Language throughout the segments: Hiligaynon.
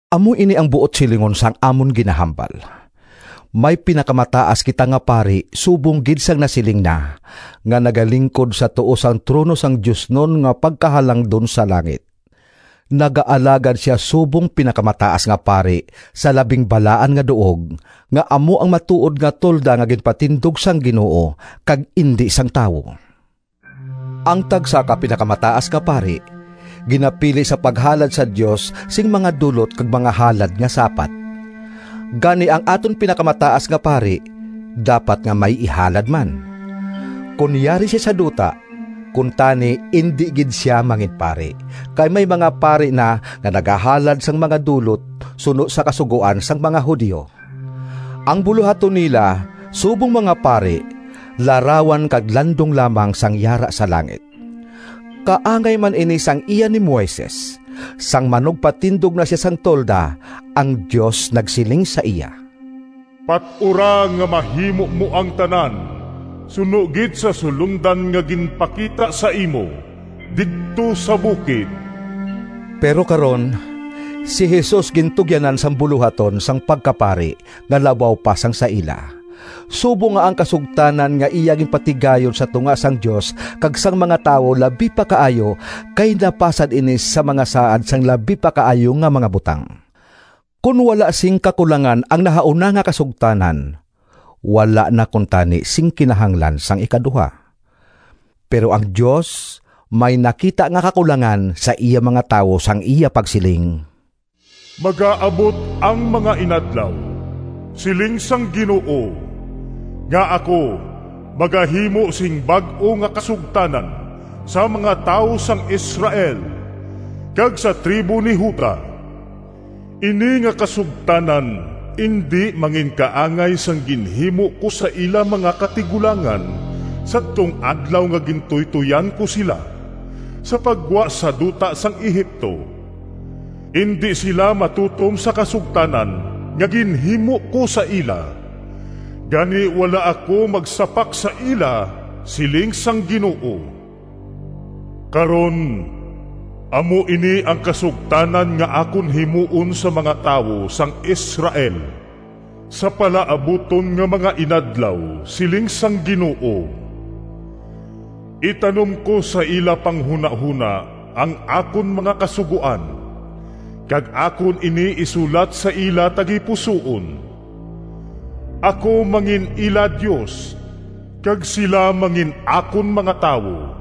Amo ini ang buot silingon sang amon ginahambal: may pinakamataas kita nga pari subong gid sang nasiling na, nga nagalingkod sa tuo sang trono sang Diosnon nga Pagkahalangdon sa langit. Nagaalagad sia subong pinakamataas nga pari sa Labing Balaan nga Duog, nga amo ang matuod nga tolda nga ginpatindog sang Ginoo, kag indi sang tawo. Ang tagsa ka pinakamataas nga pari ginapili sa paghalad sa Dios sing mga dulot kag mga halad nga sapat. Gani ang aton pinakamataas nga pari dapat nga may ihalad man. Kon yari sia sa duta, kuntani indi gid sia manginpari, kay may mga pari na nga nagahalad sang mga dulot suno sa Kasugoan sang mga Judio. Ang bulohaton nila subong mga pari larawan kag landong lamang sang yara sa langit. Kaangay man ini sang iya ni Moises. Sang manugpatindog na sia sang tolda, ang Dios nagsiling sa iya, “Pat-ura nga mahimo mo ang tanan suno gid sa sulondan nga ginpakita sa imo didto sa bukid.” Pero karon, si Jesus gintugyanan sang bulohaton sang pagkapari nga labaw pa sang sa ila, subong nga ang kasugtanan nga iya ginpatigayon sa tunga sang Dios kag sang mga tawo labi pa kaayo, kay napasad ini sa mga saad sang labi pa kaayo nga mga butang. Kon wala sing kakulangan ang nahauna nga kasugtanan, wala na kuntani sing kinahanglan sang ikaduha. Pero ang Dios may nakita nga kakulangan sa iya mga tawo sang iya pagsiling: “Magaabot ang mga inadlaw, Siling sang Ginoo, Nga ako magahimo Sing bag-o nga kasugtanan Sa mga tawo sang Israel, Kag sa tribo ni Juda. Ini nga kasugtanan Indi manginkaangay sang ginhimo ko Sa ila mga katigulangan Sadtong adlaw Nga gintuytoyan ko sila Sa paggwa sa duta sang Egipto. Indi sila matutom sa kasugtanan Nga ginhimo ko sa ila, Gani wala ako magsapak sa ila, Siling sang Ginoo. Karon, amo ini ang kasugtanan Nga akon himuon Sa mga tawo sang Israel Sa palaabuton nga mga inadlaw, Siling sang Ginoo: Itanom ko sa ila panghunahona Ang akon mga kasugoan, Kag akon ini isulat Sa ila tagipusoon. Ako mangin-ila Dios, Kag sila mangin-akon mga tawo.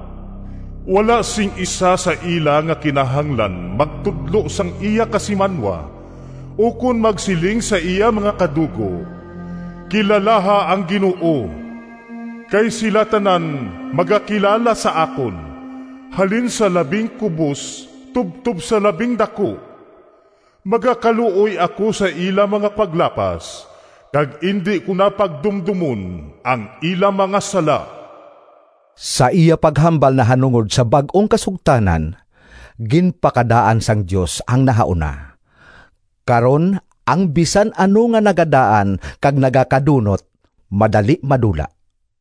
Wala sing isa sa ila Nga kinahanglan magtudlo Sang iya kasimanwa, Ukon magsiling sa iya mga kadugo, ‘Kilalaha ang Ginoo.’ Kay sila tanan magakilala sa akon, Halin sa labing kubos Tubtob sa labing daku. Magakaluoy ako sa ila mga paglapas, Kag indi ko na pagdumdomon Ang ila mga sala.” Sa iya paghambal nahanungod sa bag-ong kasugtanan, ginpakadaan sang Dios ang nahauna. Karon ang bisan ano nga nagadaan kag nagakadunot madali madula.